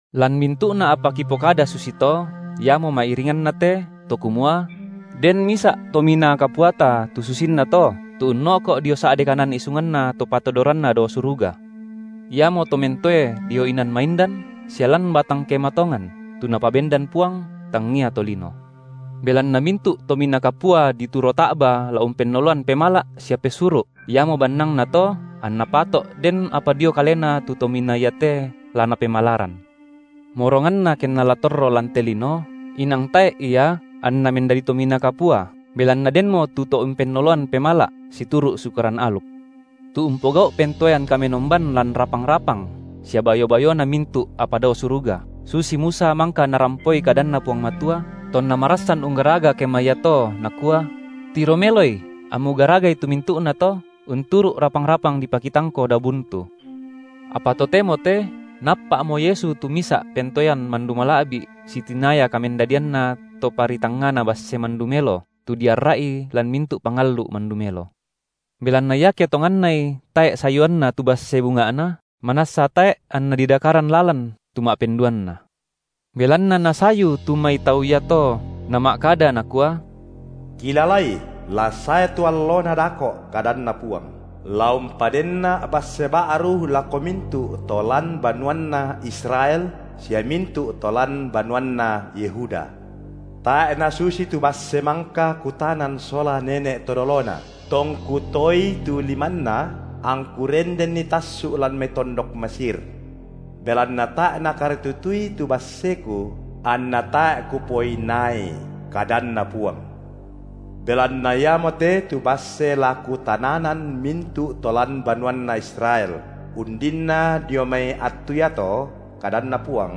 Lan mintu’na apa kipokada susito iamo ma’iringanna te, to kumua: Den misa’ Tominaa Kapuata tu susinnato, tu unno’ko’ dio sa’de kanan isunganNa Topatodoranna dao suruga. Iamo to mentoe dio inan maindan sia lan batang kema tongan, tu Napabendan Puang, tangia tolino. Belanna mintu’ tominaa kapua dituro ta’ba la umpennoloan pemala’ sia pesuru’, iamo bannangnato anna pato’ den apa dio Kalena tu Tominaa iate la Napemalaran. Moronganna kenna la torro lan te lino, inang tae’ Ia anNa mendadi Tominaa Kapua, belanna denmo tu to umpennoloan pemala’ situru’ Sukaran aluk. Tu umpogau’ pentoean kamenomban lan rapang-rapang sia bayo-bayona mintu’ apa dao suruga, susi Musa mangka narampoi kadanNa Puang Matua, tonna marassan unggaraga kema iato Nakua: Tiro meloi, ammu garagai tu mintu’nato, unturu’ rapang-rapang dipakitangko dao buntu. Apa totemo te Naappa’mo Yesu tu misa’ pentoean mandu mala’bi’ sitinaya kamendadianNa Toparitangngana basse mandu melo, tu diarra’i lan mintu’ pangallu’ mandu melo. Belanna iake tongannai tae’ sayuanna tu basse bunga’na, manassa tae’ anna didakaran lalan tu ma’penduanna. Belanna Nasayu tu mai tau iato Nama’kada Nakua: Kilalai, la sae tu allona dako’ kadanNa Puang, la umpadenNa’ basse ba’ru lako mintu’ to lan banuanna Israel sia mintu’ to lan banuanna Yehuda. Tae’ nasusi tu basse mangka Kutanan sola nene’ to dolona, tongKu toei tu limanna, angKu rendenni tassu’ lan mai tondok Mesir. Belanna tae’ nakaritutui tu basseKu, anna tae’ Kupoinaai, kadanNa Puang. Belanna iamote tu basse la Kutananan mintu’ to lan banuanna Israel, undinna dio mai attu iato, kadanNa Puang: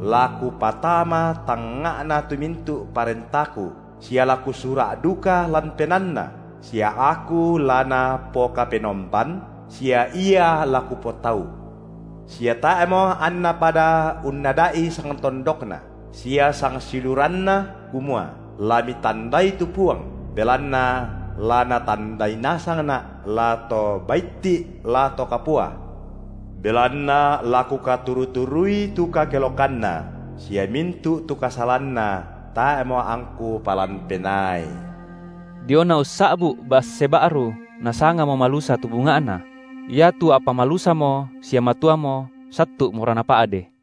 la Kupatama tangnga’na tu mintu’ parentaKu, sia la Kusura’ duka lan penaanna, sia Aku la napoKapenomban, sia ia la Kupotau. Sia tae’mo anna pada unnada’i sangtondokna, sia sangsiuluranna, kumua: La mitandai tu Puang! Belanna la na tandai nasangNa’, la to baitti’, la to kapua. Belanna la Kukaturu-turui tu kakelokanna, sia mintu’ tu kasalanna tae’mo angKu palan penaai. Diona ussa’bu’ basse ba’ru Nasangamo malusa tu bunga’na; iatu apa malusamo sia matuamo sattu’mora napa’de.